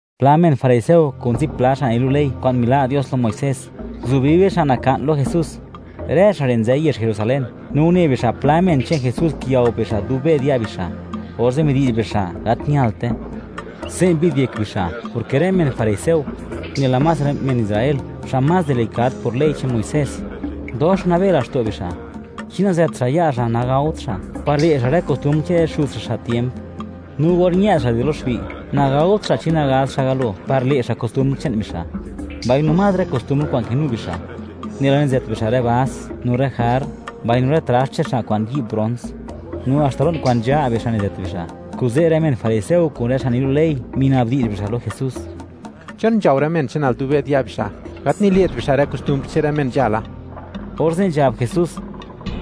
Pla men fariseo kun zipla xa' nilu' ley kwa'n mila' Dios lo Muisés, nguzubi bixa' naka'n lo Jesús. Rë xa' re' nzë yezh Jerusalén. No une bixa', pla men che'n Jesús kiyao bixa' dub be'd ya' bixa' orze' midi'zh bixa': “Gat ñalte.” (Se' mbi'd yek bixa', porke rë men fariseo, nela más rë men Israel xa' más delikad por ley che'n Muisés, dox nabe laxto' bixa'. Chi nazëtt xa' ya' xa', nagaot xa', par le' xa' rë kostumbr che'n rë xuz xa', xa' tiemp. No or ñë'd xa' di lo xbi', nagaot xa' chi nagaz xa' galo, par le' xa' kostumbr che'n bixa'; mbaino más rë kostumbr kwa'n kinu bixa', nela nizët bixa' rë vas no rë jarr, mbaino rë traxt che'n xa' kwa'n yi'b brons; no haxta lo'n kwa'n nzha' bixa' nizët bixa'.) Kuze' rë men fariseo kun rë xa' nilu' ley, mina'bdi'zh bixa' lo Jesús: ―¿Chon nzhao rë men che'nal dub be'd ya' bixa', gat nile't bixa' rë kostumbr che'n rë men nzhala? Orze' nzhab Jesús: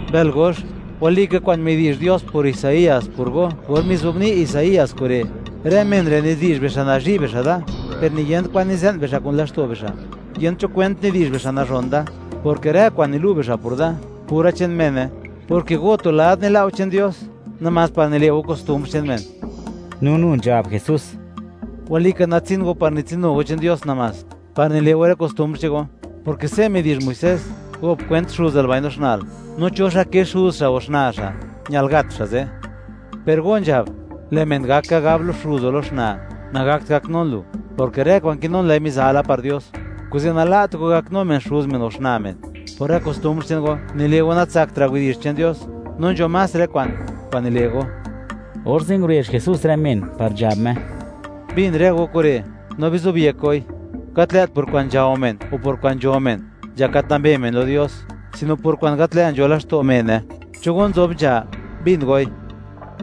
―¡Mbël gox! Walika kwa'n midi'zh Dios por Isaías por go or mizobni' Isaías kure': Rë men re'; nidi'zh bixa' nazhi' bixa' da, per niyent kwan nize'n bixa' kun laxto' bixa'. Yent cho kwent nidi'zh bixa' nazhon Da; porke rë kwa'n nilu' bixa' por Da, pura che'n mene. Porke go, tu lad nila' go che'n Dios, namás par nile' go kostumbr che'n men. No nu nzhab Jesús: ―¡Walika natsin go par nitsinu go che'n Dios namás, par nile' go rë kostumbr che'n go!, porke se' midi'zh Muisés: “Gop kwent xuzal mbaino xna'l”, no, “Cho xa' ke xuz xa' o xna' xa', ñal gat xa' ze'.” Per go nzhab: “Lë' men gak ka gab lo xuz o lo xna': Nagakt gaknun lu, porke rë kwa'n kinun, lë'i mizala par Dios.” Kuze' nala't go gaknu men xuz men o xna' men. Por rë kostumbr che'n go, nile' go natsaktra' widi'zh che'n Dios, no nzho más rë kwa'n, kwa'n nile' go. Orze' ngurezh Jesús rë men, par nzhab Me: ―Bin rë go kure', no bizobyek goi: Gat lë't por kwa'n nzhao men o por kwa'n nzho men, nzhak gat nambe men lo Dios, sino por kwa'n gat lë' nzho laxto' mene. Cho go nzob nzha, bin goi.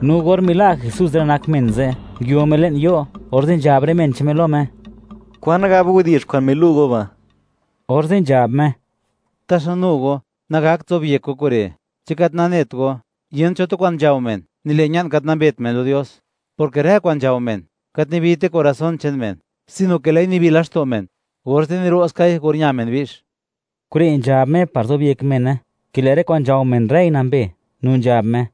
No or mila' Jesús rë nak men ze', nguio Me le'n yo', orze' nzhab rë men che'n Me lo Me: ―¿Kwan gab widi'zh kwa'n milu' go ba'? Orze' nzhab Me: ―¿Taxa nu go, nagakt zobyek go kure'? ¿Chi gat nanet go, yent cho tu kwa'n nzhao men, nile' ña'n gat nambet men lo Dios?, porke rë kwa'n nzhao men, gat nibite corazón che'n men, sino ke lë'i nibi laxto' men, orze' niro'skai or ña xa' bi'x. Kure' nzhab Me, par zobyek mene, ke lë' rë kwa'n nzhao men, rëi nambe. No nzhab Me: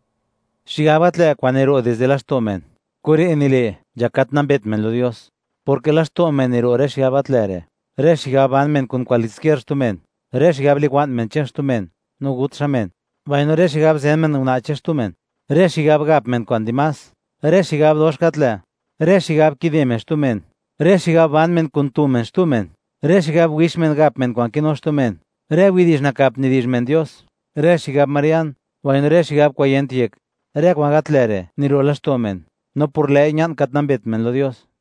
―Xigab gat lë' kwa'n niro' dizde laxto' men, kure' nile', nzhak gat nambet men lo Dios, porke laxto' men niro' rë xigab gat lë' re': Rë xigab ban men kun kwaliskier xtu men, rë xigab liwa'n men che'n xtu men, no gut xa' men; mbaino rë xigab zen men una' che'n xtu men, rë xigab gap men kwa'n dimás, rë xigab dox gat lë', rë xigab kide men xtu men, rë xigab ban men kun tu men xtu men, rë xigab wix men gap men kwa'n kinu xtu men, rë widi'zh nakap nidi'zh men Dios, rë xigab marian, mbaino rë xigab kwa'n yent yek. Rë kwa'n gat lë' re' niro' laxto' men, no por lë'i, ña'n gat nambet men lo Dios.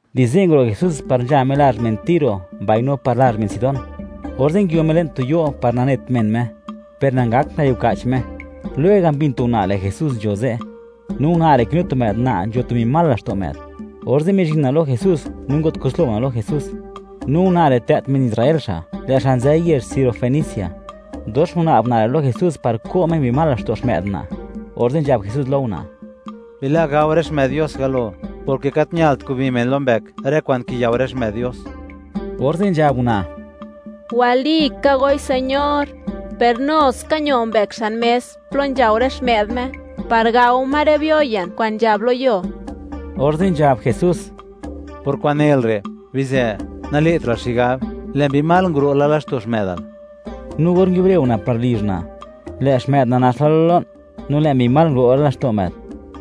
Di ze' nguro' Jesús par nzha Me lazh men Tiro mbaino par lazh men Sidón. Orze' nguio Me le'n tu yo' par nanet men Me, per nangakt ngayuka'ch Me. Lwega', mbin tu una', lë' Jesús nzho ze'; no una' re' kinu tu më'd una', nzho tu mbi mal laxto' më'd. Orze' mizhin una' lo Jesús, no ngo't kuslo una' lo Jesús. No una' re' tlë't men Israel xa', lë' xa' nzë yezh sirofenicia. Dox nguna'b una' lo Jesús par ko' Me mbi mal laxto' xmë'd una', orze' nzhab Jesús lo una': ―Bila' gao rë xmë'd Dios galo; porke gat ñalt, kubi men lo mbëk rë kwa'n kiyao rë xmë'd Dios. Orze' nzhab una': ―Walika goi Señor, per no ska ño mbëk xan mes plo nzhao rë xmë'd Dios, par gao ma rë biyo ye'n kwa'n nzhab lo yuo. Orze' nzhab Jesús: ―Por kwa'n nel re', bizë; nale'tra'l xigab, lë' mbi mal nguro' la laxto' xmë'dal. No or nguiubre una' par lizh una', lë' xmë'd una' nax la lo lo'n, no lë' mbi mal nguro' la laxto' më'd.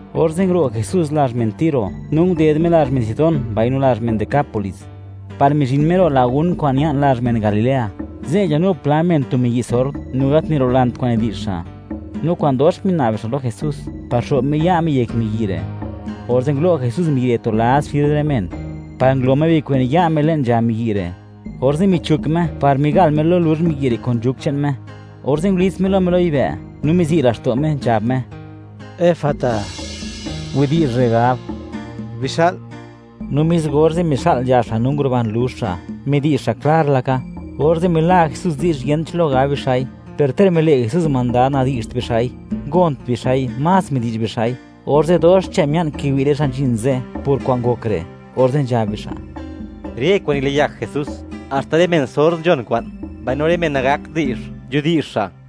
Orze' nguro' Jesús lazh men Tiro, no nded Me lazh men Sidón mbaino lazh men Decápolis, par mizhin Me ro' lagún kwa'n ña'n lazh men Galilea. Ze' ñanu pla men tu miyi' sord, no gat nirolant kwa'n nidi'zh xa'; no kwa'n dox mina'b bixa' lo Jesús, par xo'b Me ya' Me yek miyi' re'. Orze' ngulo' Jesús miyi' re' tu lad xid rë men, par ngulo Me bikwen ya' Me le'n nzha miyi' re', orze' michuk Me par migal Me lo luzh miyi' re' kun nzhuk che'n Me, orze' ngulits Me lo Me lo yibë', no mizi' laxto' Me, nzhab Me: ―¡Efata! (Widi'zh re' gab: “Bixa'l”). No mis orze', mixa'l nzha xa' no nguruban luzh xa', midi'zh xa' klar laka. Orze' mila' Jesús di'zh, yent cho lo gab bixa'i; per ter mile' Jesús mandad, nadi'zht bixa'i, ngont bixa'i, más midi'zh bixa'i. Orze' dox xche mia'n kiwi' rë xa' nzhin ze' por kwa'n ngok re', orze' nzhab bixa': ―¡Rë kwa'n niliyak Jesús! Haxta rë men sord, nzhon kwa'n; mbaino rë men nagakt di'zh, nzhudi'zh xa'.